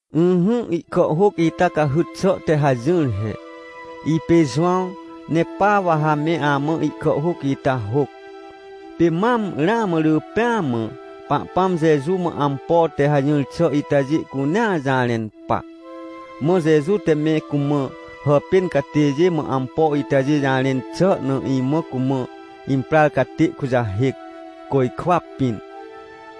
Ỹhỹ, ihkàhhôc ita cahyt xà te hajỹr he. Ipê Jowãw, ne pa wa ha me amã ihkàhhôc ita hôc. Pê mam, ramã rỳ pêa mã, Pahpãm Jeju mã ampo te hajỹr xà itajê cunea jarẽn pa. Mã Jeju te me cumã hàpên catêjê mã ampo itajê jarẽn xà na, imã cumã imprar catê kujahêc, côjkwa pĩn.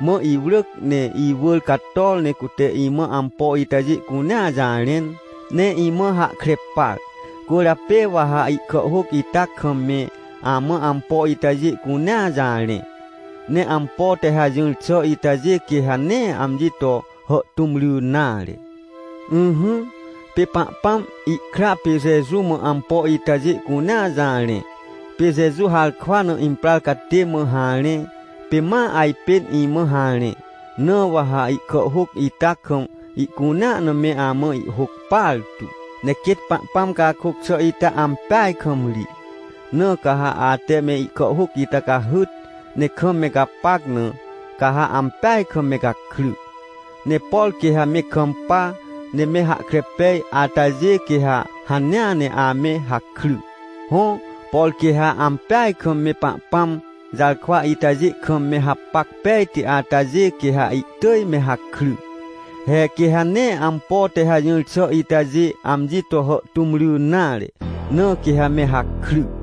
Mã iwrỳc, ne iwỳr cator ne cute imã ampo itajê cunea jarẽn, ne imã hahkre par. Cwỳrjapê wa ha ihkàhhôc ita kam, me amã ampo itajê cunea jarẽ. Ne ampo te hajỹr xà itajê, quê ha nee amji to hàhtũm ry nare. Ỹhỹ, pê Pahpãm, ihkra pê Jeju mã ampo itajê cunea jarẽ, pê Jeju harkwa na imprar catê mã harẽ, pê ma ajpên imã harẽ, na wa ha ihkàhhôc ita kam ihcunea na me amã ihhôc partu. Ne quêt Pahpãm cakôc xà ita ampeaj kam ri. Na ca ha ate me ihkàhhôc ita cahyt, ne kam me gapac na, ca ha ampeaj kam me gakry. Ne por quê ha me kampa ne me hahkre pej atajê, quê ha hanea ne ame hakry. Hõ, por quê ha ampeaj kam me Pahpãm jarkwa itajê kam, me hapac pejti atajê, quê ha ihtỳj me hakry. He, quê ha nee ampo te hajỹr xà itajê amji to hàhtũm ry nare, na quê ha me hakry.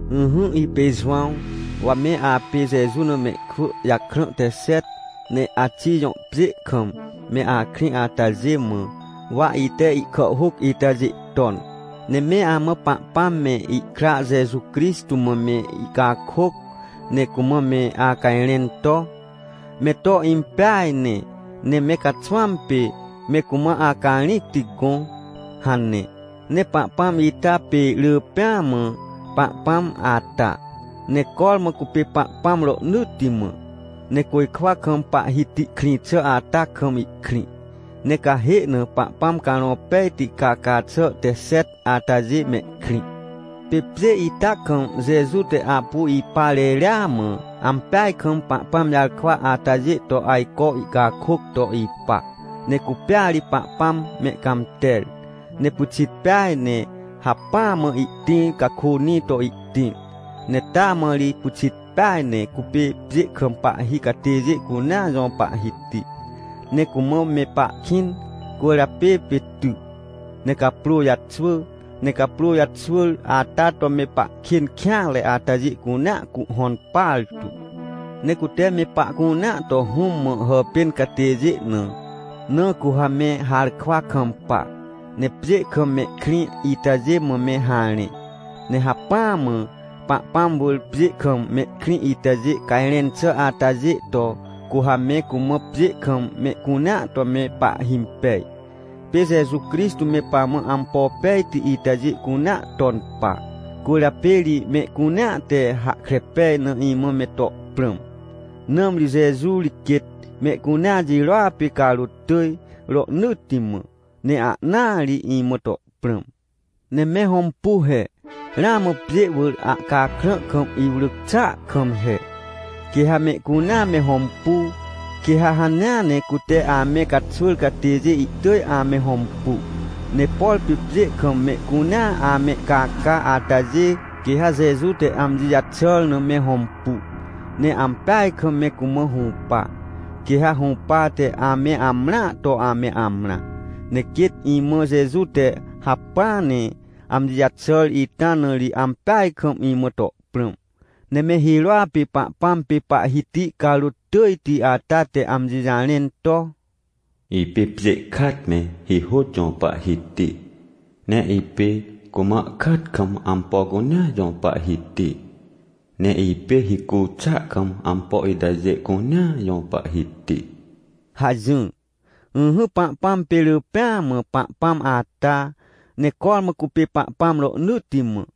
Ỹhỹ, ipê Jowãw, wa me apê Jeju na mehkwỳ jakrã te xet, ne Axij jõ pjê kam me akrĩ atajê mã, wa ite ihkàhhôc itajê ton. Ne me amã Pahpãm me, ihkra Jeju Crixtô mã me icakôc, ne cumã me acajrẽn to: — Me to impeaj ne, ne me caxwãm pê me cumã acarĩcti gõ — hane. Ne Pahpãm ita pê rỳ pêa mã Pahpãm ata, ne cormã cupê Pahpãm rohnỳtti mã, ne côjkwa kam Pahhiti krĩ xà ata kam ihkrĩ. Ne cahê na Pahpãm Carõ Pejti caca xà te xet atajê mehkrĩ. Pê pjê ita kam Jeju te apu ipa reria mã, ampeaj kam Pahpãm jarkwa atajê to ajco ihcakôc to ipa. Ne cupêa ri Pahpãm mehcãmter, ne pyxit peaj ne hacpỹa mã ihtĩr cakônĩ to ihtĩr, ne taa mã ri pyxit peaj ne cupê pjê kam pahhi catêjê cunea jõ Pahhiti. Ne cumã me pahkĩn, cwỳrjapê pê ty ne caprô jaxwỳ. Ne caprô jaxwỳr ata to me pahkên kêanre atajê cunea cuhhõn partu. Ne cute me pahcunea to Hũm mã hàpên catêjê na. Na cu ha me harkwa kampa, ne pjê kam mehkrĩ itajê mã me harẽ. Ne hacpỹa mã Pahpãm wỳr, pjê kam mehkrĩ itajê cajrẽn xà atajê to, cu ha me cumã, pjê kam mehcunea to me pahhimpej. Pê Jeju Crixtô me pamã ampo pejti itajê cunea ton pa. Cwỳrjapê ri mehcunea te hahkre pej na imã me to prãm, nãmri Jeju ri quêt mehcunea jirôa pê carôt tỳj rohnỳtti mã! Ne ahnaa ri imã to prãm! Ne me hõmpu he, ramã pjê wỳr ahcakrã kam iwrỳc xàa kam he! Quê ha mehcunea me hõmpu, quê ha hanea ne cute ame caxwỳr catêjê ihtỳj ame hõmpu. Ne por pê pjê kam mehcunea amehcaca atajê, quê ha Jeju te amji jaxàr na me hõmpu, ne ampeaj kam me cumã hũpa. Quê ha hũpate ame amrãa to ame amrã. Ne quêt imã Jeju te hacpỹa ne amji jaxàr ita na ri ampeaj kam imã to prãm. Ne me hirôa pê Pahpãm pê Pahhiti carôt tỳjti ata te amji jarẽn to: — Ipê pjê kat me hihôt jõ Pahhiti, ne ipê cumã kat kam ampo cunea jõ Pahhiti, ne ipê hicu xàa kam ampo itajê cunea jõ Pahhiti — hajỹr. Ỹhỹ, Pahpãm pê rỳ pêa mã Pahpãm ata, ne cormã cupê Pahpãm rohnỳtti mã.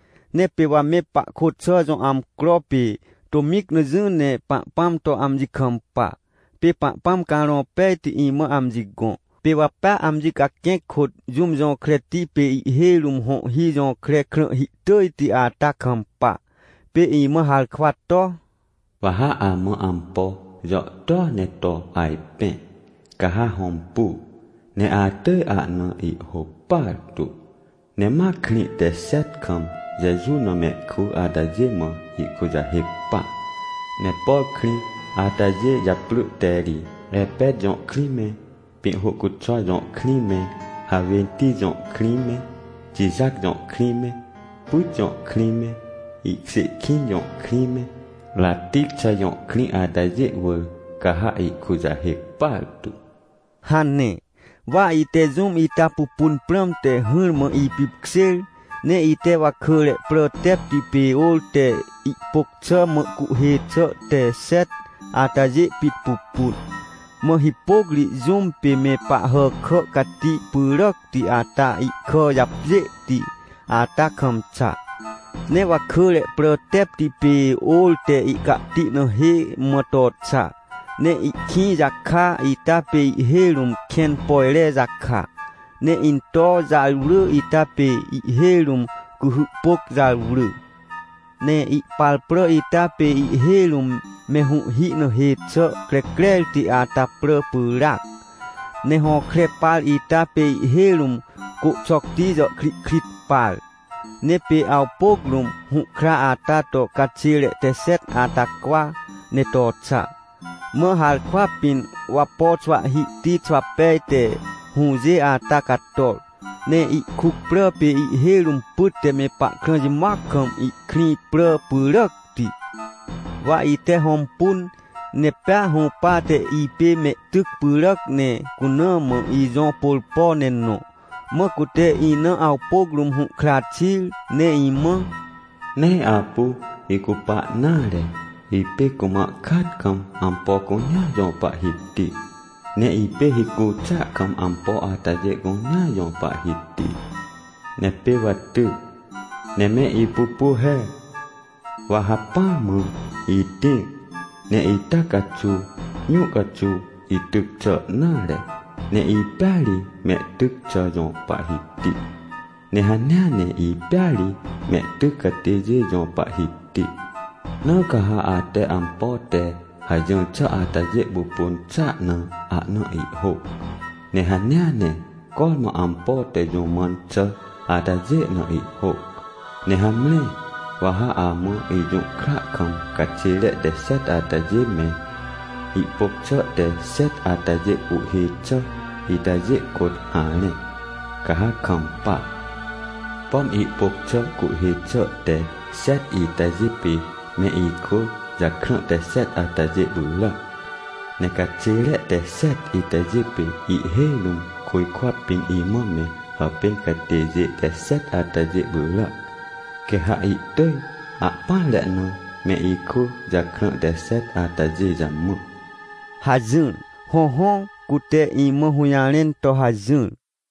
Ne pê wa me pahkôt xà jõ amcro pê tômĩc na jỹ ne Pahpãm to amji kampa. Pê Pahpãm Carõ Pejti imã amji gõ. Pê wa pea amji caquẽc kôt jũm jõkreti, pê ihhêj rũm hõhhi jõkre krãhhi tỳjti ata kampa. Pê imã harkwa to: — Wa ha amã ampo jàhtôa ne to ajpẽ, ca ha hõmpu ne atỳj ahna ihhôc partu. Ne ma krĩ te xet kam Jeju na mehkwỳ atajê mã ihkujahêc pa. Ne por krĩ atajê japrỳ te ri Epet jõ krĩ me, Pĩhhôcuxwa jõ krĩ me, Hawênti jõ krĩ me, Tijat jõ krĩ me, Pyt jõ krĩ me, Ihkjê kĩn jõ krĩ me, Ratixa jõ krĩ atajê wỳr ca ha ihkujahêc partu — hane. Wa ite jũm ita pupun prãmte hỹrmã ipipkjêr, ne ite wakỳre prà tepti pê ôr te ihpôc xà mã cuhhê xà te xet atajê pit pupun. Mã hipôc ri jũm pê me Pahhàkà Cati pyràcti ata ihkà japjêhti ata kam xa. Ne wakỳre prà tepti pê ôr te ihcahti na hê mã to xa. Ne ihkĩ jaka ita pê ihhêj rũm kẽn pojre jaka, ne into jarwrỳ ita pê ihhêj rũm cuhy pôc jarwrỳ. Ne ihpar prà ita pê ihhêj rũm me hũhhi na hê xà crecrerti ata prà pyràac. Ne hõkre par ita pê ihhêj rũm côhxocti jàhkrihkrit par. Ne pê awpôc rũm, hũhkra ata to caxêre te xet ata cwa ne to xa. Mã harkwa pĩn wapo xwahhihti xwapeaj te hũjê ata cator. Ne ihkuc prà pê ihhêj rũm pyt te me pahkrã jimoac kam ihkrĩ prà pyràcti. Wa ite hõmpun, ne pea hũpate ipê mehtyc pyràc, ne cuna mã ijõ pôrpo ne nõ. Mã cute ina awpôc rũm hũhkra xir ne imã: — Nee apu icupa nare. Ipê cumã kaat kam ampo cunea jõ Pahhiti, ne ipê hicu xàa kam ampo atajê cunea jõ Pahhiti. Ne pê wa ty, ne me ipupu he, wa hacpỹa mã itĩr, ne ita caxuw jũ caxuw ityc xà nare, ne ipêa ri mehtyc xà jõ Pahhiti, ne hanea ne ipêa ri mehtyc catêjê jõ Pahhiti. — Na ca ha ate ampo te hajỹr xà atajê pupun xàa na, ahna ihhôc. Ne hanea ne cormã ampo te jũ mãn xà atajê na ihhôc. Ne hamre, wa ha amã ijũhkra kam caxêre te xet atajê me, ihpôc xà te xet atajê cuhhê xà itajê kôt harẽ, ca ha kampa. Pom ihpôc xà cuhhê xà te xet itajê pê me ikwỳ jakrã te xet atajê pyràac. Ne caxêre te xet itajê pê ihhêj rũm côjkwa pĩn imã me hàpên catêjê te xet atajê pyràac, quê ha ihtỳj ahpỹanre na me ikwỳ jakrã te xet atajê jamã — hajỹr. Hõhõ, cute imã hũjarẽn to hajỹr.